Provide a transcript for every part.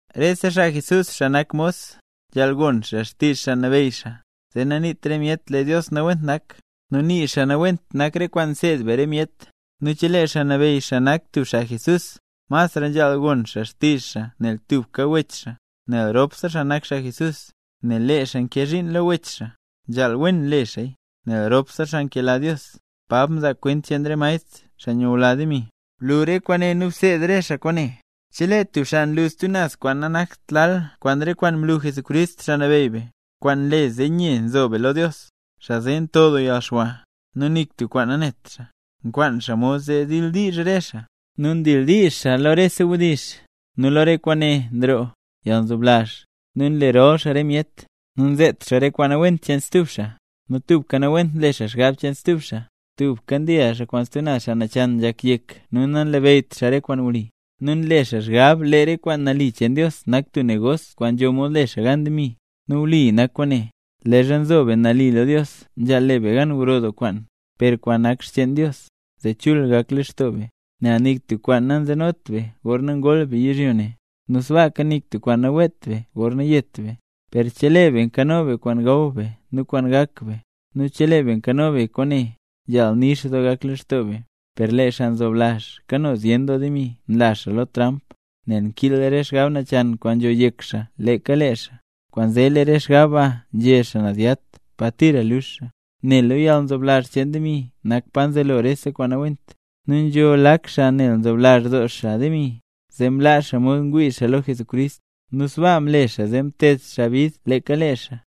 Rese xaa Jesús, xaa nak mos, nzhaal gon xaa xtizh xaa nabeyy xaa, zee naniit re myet lee Dios nawent nak, nu nii xaa nawent nak re kwaan nseed be re myet. Nu chelee xaa nabeyy xaa nak tub xaa Jesús, masra nzhaal gon xaa xtizh xaa nel tubka wech xaa, nel ropse xaa nak xaa Jesús. Nel lee xaa nkee zhiin lo wech xaa, nzhaal le wen xaaya, nel ropse xaa nkela Dios. Pab mzaa kwent cheen re maestr, xaa nyula demi Blu re kwaane nu bseed re xaa kwaane. Chelee tub xaa nlu stub naz kwaan nanakt lal kwaan re kwaan mlu Jesucrist, Xaa Nabeyy be, kwaan nle zee nye nzo be lo Dios, xaa zee nto doo yalxwa, nu nik tub kwaan nanet xaa, nkwaan xaa mod zee dildiizh re xaa, nu ndildiizh xaa lo rese wdizh. Nu lo re kwaane nroo yalnzoblazh, nu nle rol xaa re myet, nu nzet xaa re kwaan nawent cheen stub xaa, nu tubka nawent nle xaa xgab cheen stub xaa. Tubka ndil xaa kwaan stub naz xaa nachan nzhak yek nu nanlabeyyt xaa re kwaan wli. Nu nle xaa xgab lee re kwaan nali cheen Dios nak tub negos kwaan nzho mod le xaa gan demi. Nu wli nak kwaane, leezha nzo be nali lo Dios nzhaal le be gan gro doo kwaan, per kwaan nak xcheen Dios, zee chul gak lextoo be. Nel nik tub kwaan nanzenot be gorna ngol be yizhyo ne, nu sbaaka nik tub kwaan naweet be gorna yet be. Per chelee be nkano be kwaan gaw be nu kwaan gak be; nu chelee be nkano be kwaane, nzhaal nix doo gak lextoo be. Per lee xaa nzoblazh kano zyen doo demi nla xaa lo tramp, nel nkiil re xgab nachan kwaan nzho yek xaa leeka lee xaa. Kwaanzee lee re xgab ba nzhe xaa naz yat pa tira lux xaa. Nel lo yalnzoblazh cheen demi nak pa nzelo rese kwaan nawent. Nu nzho lak xaa nel nzoblazh doo xaa demi, zee mlaa xaa mod mwii xaa lo Jesucrist, nu sbaa mle xaa zee mted xaa bid leeka lee xaa.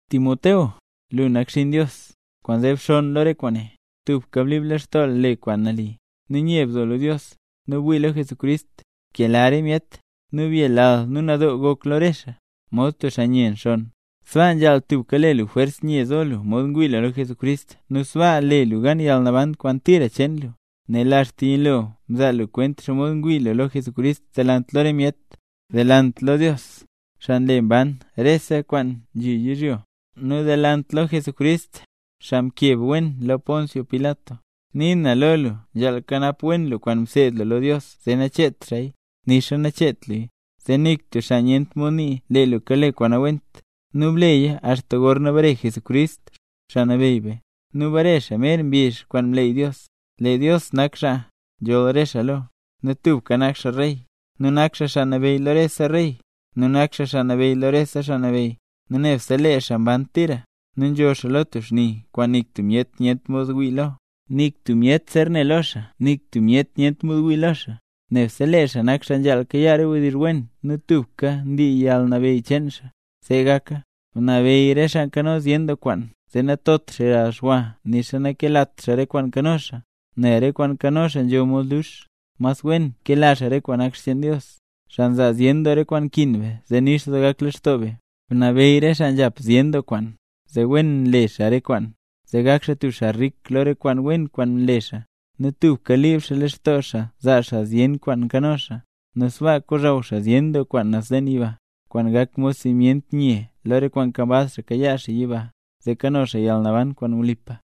Timoteo, lu nak xinn Dios. Kwaanzee bxonn lo re kwaane. Tubka blib lextoo lu: Le kwaan nali, nu nye bzo lo Dios, nu wii lo Jesucrist, bkela re myet, nu byelal, nu nadoo gok lo re xaa. Mod tub xaa nye nxonn, sbaa nzhaal tubka le lu jwers nye zo lu mod ngwii lu lo Jesucrist nu sbaa le lu gan yalnaban kwaan tira cheen lu, nel axta yilo mzaa lu kwent xomod ngwii lu lo Jesucrist delant lo re myet. Delant lo Dios, xaa nle mban rese kwaan nzhi yizhyo, nu delant lo Jesucrist, xaa mkeb wen lo Poncio Pilat, nii na lo lu nzhaal kanap wen lu kwaan mseed lu lo Dios zee nacheet xaaya, nixa nacheet luya, zee nik tub xaa nyent mod nii lee lu kale kwaan nawent. Nu bleya axta gorna bare Jesucrist, Xaa Nabeyy be. Nu bare xaa mer mbizh kwaan mleey Dios. Lee Dios nak xaa nzholl re xaa lo, nu tubka nak xaa rey, nu nak xaa Xaa Nabeyy lo rese rey, nu nak xaa Xaa Nabeyy lo rese xaa nabeyy, nu nebse lee xaa mban tira, nu nzho xaa lo tub xni kwaan nik tub myet nyent mod wii lo. Nik tub myet zer ne lo xaa nixa nik tub myet nyent mod wii lo xaa. ¡Nebse lee xaa nak xaa nzhaal kayaa re wdizh wen nu tubka ndii yalnabeyy cheen xaa! ¡See gaka! Bnabeyy re xaa nkano zyen doo kwaan, zee natot xaa yalxwa nixa nakelat xaa re kwaan nkano xaa, nel re kwaan nkano xaa nzho mod lux. Mas wen kela xaa re kwaan nak cheen Dios, xaa nzaa zyen doo re kwaan nkin be zee nix doo gak lextoo be. Bnabeyy re xaa nzhap zyen doo kwaan, zee wen le xaa re kwaan, zee gak xaa tub xaa rik lo re kwaan wen kwaan nle xaa, nu tubka liib xaa lextoo xaa zaa xaa zyen kwaan nkano xaa. Nu sbaa kozhaw xaa zyen doo kwaan naz leen yiba, kwaan gak mod simyent nye lo re kwaan nkambaz xaa kayaa xaa yiba, zee kano xaa yalnaban kwaan wlipa.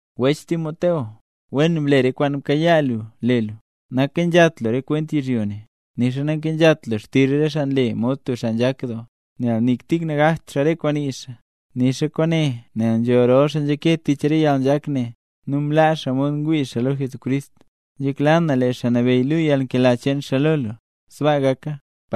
Wech Timoteo. Wen ble re kwaan mkayaa lu le lu. Nankenzhat lu re kwent yizhyo ne, nixa nankenzhat lu xtizh re xaa nle mod tub xaa nzhak doo, nel nik tik nagakt xaa re kwaan nii xaa. Nii na kwaane nel nzho rol xaa nzhake tich re yalnzhak ne, nu mlaa xaa mod ngwii xaa lo Jesucrist. Nzhekla na lee Xaa Nabeyy luu yalnkela cheen xaa lo lu. Sbaa gaka.